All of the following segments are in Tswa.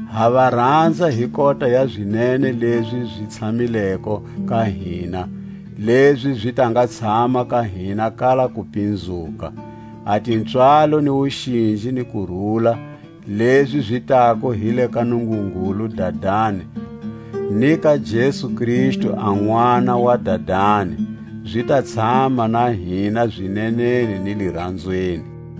Ha va ranza hi kota ya zinene lezi zi tshamileko ka hina, lezi zi ta nga tshama ka hina kala kupinzuka. A tipswalo ni wuxinji ni kurula, lezi zi tako hi le ka Nungungulu Dadani, ni ka Jesu Kristu a Nʼwana wa Dadani, zi ta tshama na hina zineneni ni liranzweni.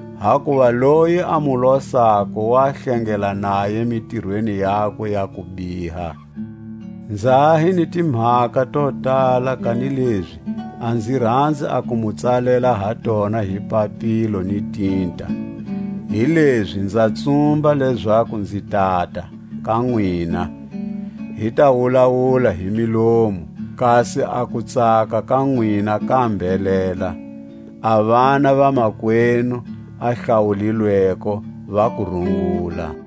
hakuva loyi a mu losako wa hlengela naye mitirweni yakwe ya kubiha. Nza ha hi ni timhaka to tala, kanilezi a nzi ranzi a ku mu tsalela ha tona hi papilo ni tinta; hilezi nza tsumba lezaku nzi tata, ka nwina, hi ta wulawula hi milomu, kasi a kutsaka ka nwina ka mbhelela. A vana va makwenu a hlawulilweko va ku rungula.